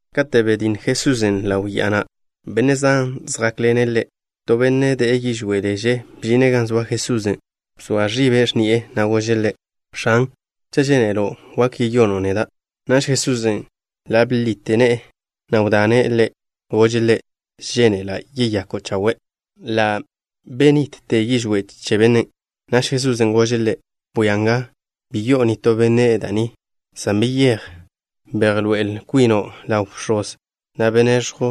Kate' betj Jesusen' ḻaw ya'a na', benne' zan zjákḻene' Ḻe'. To benne' de'e yižwé' leže bžine' gan zoa Jesusen'. Bzoa ẕibe' x̱ni'e, na' gože' Ḻe': —X̱an, cha' žénelo', wak yeyono' neda'. Naž Jesusen' ḻa' bḻite ne'e, na' wdane' ḻe'. Gože' ḻe': —Žénela'. Yeyako' chawe'. Ḻa' benitte yižwé' che bennen'. Naž Jesusen' gože' ḻe': —Bwia nga, bi yi'o nitó benne' da' ni, san beyéj, bejḻoé'el kwino' ḻaw bx̱oz, na' bejneẕjw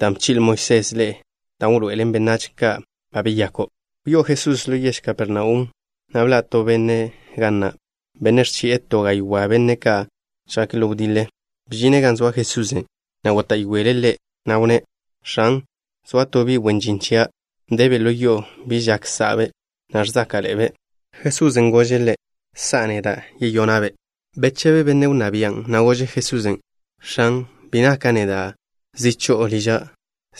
dan' bchi'le Moisés ḻe'e, dan' wḻoé'elen benách ka' ba beyako'. Wyáz Jesusen' ḻo yež Kapernaum, na' bḻa' to benne' ga na', benne' ẕchi'e to gaywá' benne' ka' žjake' ḻo wdiḻe. Bžine' gan zoa Jesusen', na' góta'yoele' Ḻe', na' wnné': —X̱an, zoa to bi' wen žin chia', debe' ḻo yo'o. Bi žak sa'be', na' ẕzáka'ḻe'ebe'. Jesusen' gože' ḻe': —Sa'a neda', yeyona'-be'. Bechebe benne' wnná bian', na' gože' Jesusen': —X̱an, bi naka' neda' zi cho'o liža',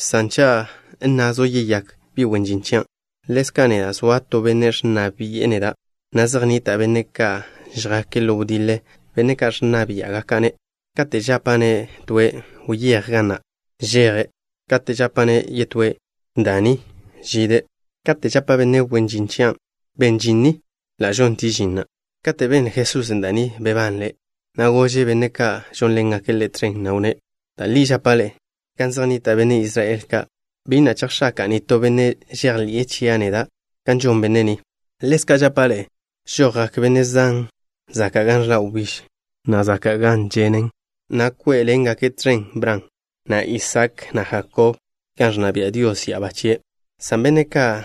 san cha' nnazo', yeyák bi' wen žin chian'. Ḻezka' neda', zoa to benne' ẕnna bi'e neda', na' zej nnita' benne' ka' žjake' ḻo wdiḻe, benne' ka' ẕnna biá'gaka'-ne'. Kate' žapa'-ne' toe': “Wyéj ga na'” žeje'. Kate' žapa'-ne' yetóe': “Da ni” žide'. Kate' žapa' benne' wen žin chia': “Ben žin ni” ḻa' žontie' žin na'. Kate' benle Jesusen' da' ni, bebanle', na' gože' benne' ka' žónḻengake' Ḻe' tẕen, na' wnné': —Da' li žapa' ḻe'e, gan zej nnita' benne' Israel ka', bi na' chejx̱aka'a nitó benne' žejḻi'e chia' neda' kan žon benne' ni. Ḻezka' žapa' ḻe'e: žojgak benne' zan zaka' gan ẕḻa' wbíž, na' zaka' gan ženen, na' kwé'ḻengake' tẕen Bran, na' Isaak, na' Jakob, gan ẕnna bia' Dios ya'abá chie', san benne' ka'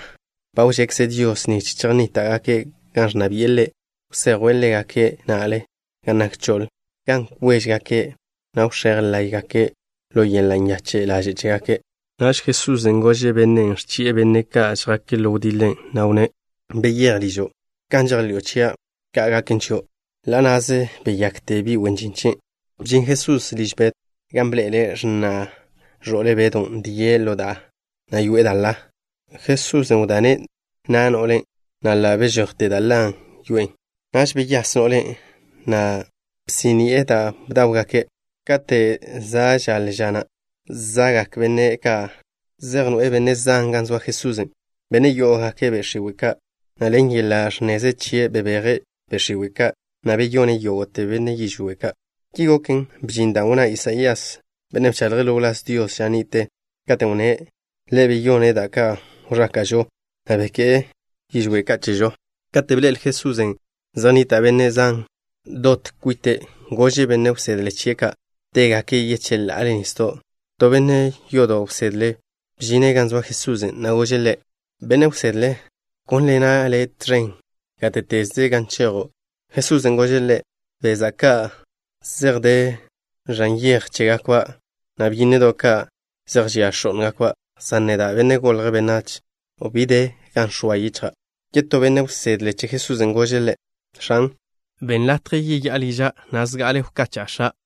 ba wžekze Dios nich chejnníta'gake' gan ẕnna bi'e Ḻe', wsejwe' ḻégake' na'le gan nak choḻ, gan kwéžegake', na' wx̱éj láye'gake' ḻo yeḻa' nyache' ḻaže' chégake'. Naž Jesusen' gože' bennen' ẕchi'e benne' ka' žjake' ḻo wdiḻe, na' wnné': —Beyéj ližo'. Kan žejḻi'o chia', ka' gaken chio'. Ḻa' na'ze beyakte bi' wen žin chien'. Bžin Jesusen' liž Bedw, gan bḻe'ele' x̱na' ẕo'le Bedon' die' ḻo da'a, na' yoe'e da' ḻa. Jesusen' wdane' na' no'len', na' ḻa' bežojte da' ḻa dan' yoe'e. Naž beyás no'len', na' bsí'ni'e da' bdáwgake'. Kate' za' žaḻe ža na', za'gak benne' ka' zej noe'e benne' zan gan zoa Jesusen', benne' yó'ogake' be' x̱iwe' ka', na' ḻen yeḻa' ẕnneze chie' bebeje' be' x̱iwe' ka', na' beyone' yógo'te benne' yižwé' ka'. Ki goken, bžin dan' wnná Isaías, benne' bchaḻje' ḻo wláz Dios ža ni'te, katen' wnné': “Ḻe' beyone' da' ka' wẕáka'žo, na' beké'e yižwé' ka' chežo.” Kate' bḻe'el Jesusen' zej nnita' benne' zan ka' dot kwite', gože' benne' wsedle chie' ka' tégake' yecheḻa'ale nisdo'. To benne' yodo' wsedle bžine' gan zoa Jesusen', na' gože' Ḻe': —Benne' wsedle, gónḻena' Le' tẕen gáte'teze gan chejo'. Jesusen' gože' ḻe': —Beza' ka' zej de ẕan yej chégakba', na' byínnedo' ka', zej žia x̱ó'ngakba', san neda', Benne' Golje' Benách, bi de gan chix̱jw yichja'. Yetó benne' wsedle che Jesusen' gože' Ḻe': —X̱an, benn latje yeyá'a liža' na' zejte wkacha'a x̱a'.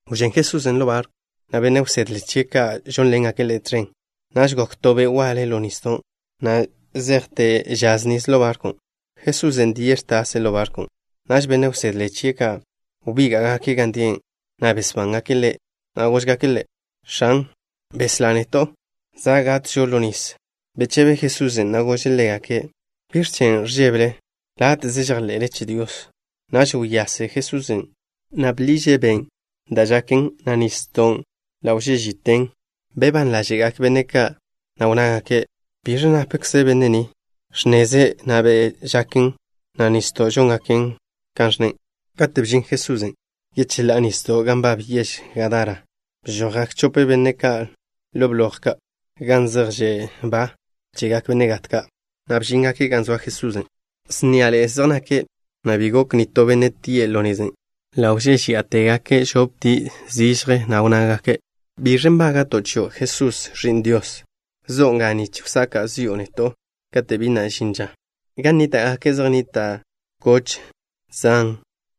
Wžén Jesusen' ḻo barkw, na' benne' wsedle chie' ka' žónḻengake' Ḻe' tẕen. Naž gok to be' waḻe ḻo nisdo', na' žasḻe'e nisdon', na' zejte žaz nis ḻo barkwn'. Jesusen' die' ẕtase' ḻo barkwn'. Naž benne' wsedle chie' ka' wbíga'gake' gan die', na' besbángake' Ḻe', na' góžgake' Ḻe': —X̱an, beslá neto'. Za' gatžo ḻo nis. Bechebe Jesusen', na' gože' ḻégake': —¿Biẕ chen' ẕžébele? Láte'ze žejḻe'le che Dios. Naž wyase Jesusen', na' bḻiže' ben' da' žaken, na' nisdon', na' ḻa' wžé'tegaken ži. Bebán ḻáže'gak benne' ka', na' wnnágake': —¿Biẕ napkze benne' ni? Ẕnneze', na' be' žaken, na' nisdo' žóngaken kan ẕnne'. Kate' bžin Jesusen' yecheḻá'a nisdo' gan nbab yež Gadara, bžojgak chope benne' ka' ḻo bloj ka' gan zej že' ba chegak benne' gat ka', na' bžíngake' gan zoa Jesusen'. Sníaḻe'e zej nake', na' bi gok nitó benne' tie' ḻo nezen'. Ḻa' wžéžeya'agak žoptie' zižje, na' wnnágake': —¿Biẕ nbága'to' chio', Jesús, Ẕi'n Dios? ¿Zo'o nga nich wsaka' zi'o neto' kate' bi na' žin ža? Gan nníta'gake' zej nnita' koch zan,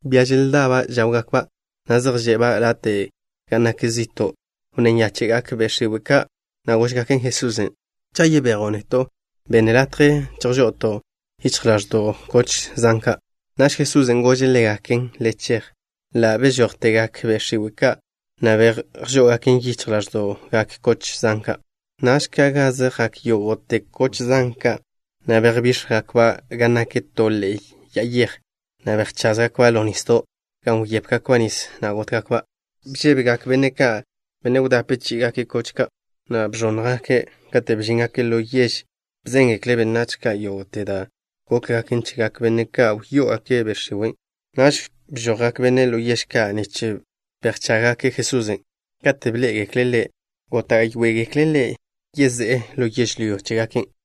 bia želdaba' žáwgakba', na' zej že'ba' late' gan nak zi'to'. Wnné nyáche'gak be' x̱iwe' ka', na' góžgaken Jesusen': —Cha' yebejo' neto', be' latje chejžo'oto' yichj ḻáẕdo'gak koch zan ka'. Naž Jesusen' gože' ḻégaken: —Le chej. Ḻa' bežójtegak be' x̱iwe' ka', na' bejžó'ogaken yichj ḻáẕdo'gak koch zan ka'. Naž ka' gaze jak yógo'te koch zan ka', na' bejbíx̱jgakba' gan nak to ḻe'e ya'a yej, na' bejcházgakba' ḻo nisdo', gan wyépgakba' nis, na' gótgakba'. Bžébegak benne' ka', benne' wdape chí'igake' koch ka', na' bẕónnjgake'. Kate' bžíngake' ḻo yež, bzéngekle' benách ka' yógo'te da' gókgaken chegak benne' ka' wyó'ogake' be' x̱iwe' ka'. Naž bžojgak benne' ḻo yež ka', nich bejchággake' Jesusen'. Kate' bḻé'egekle' Ḻe', góta'yoegekle' Ḻe' yezé'e ḻo yežlyó chégake'.